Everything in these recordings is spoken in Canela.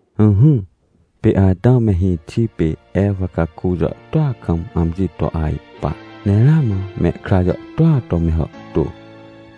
Ỹhỹ, pê Atãw me hĩxi pê Ewa caku jàhtôa kam amji to ajpa, ne ramã mehkra jàhtôa to me hàhtô.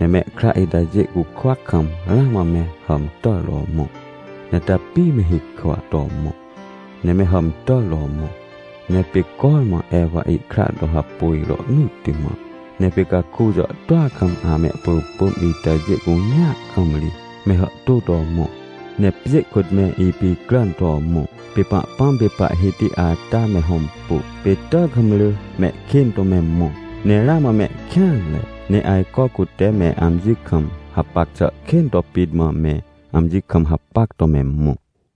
Ne mehkra itajê cukwa kam ramã me hàmtàr to mõ, ne tapi me hikwa to mõ, ne me hàmtàr to mõ. Ne pê cormã Ewa ihkra to hapôj rohnỳtti mã. Ne pê caku jàhtôa kam amehpỳpỳm itajê cunea kam ri me hàhtô to mõ, ne pjê kôt me ipicràn to mõ. Pê Pahpãm pê Pahhiti ata me hõmpu, pê tàkamrỳ mehkên to me mõ, ne ramã mehkêanre. Ne ajco cute me amji kam hapac xà kên to pit mã me amji kam hapac to me mõ.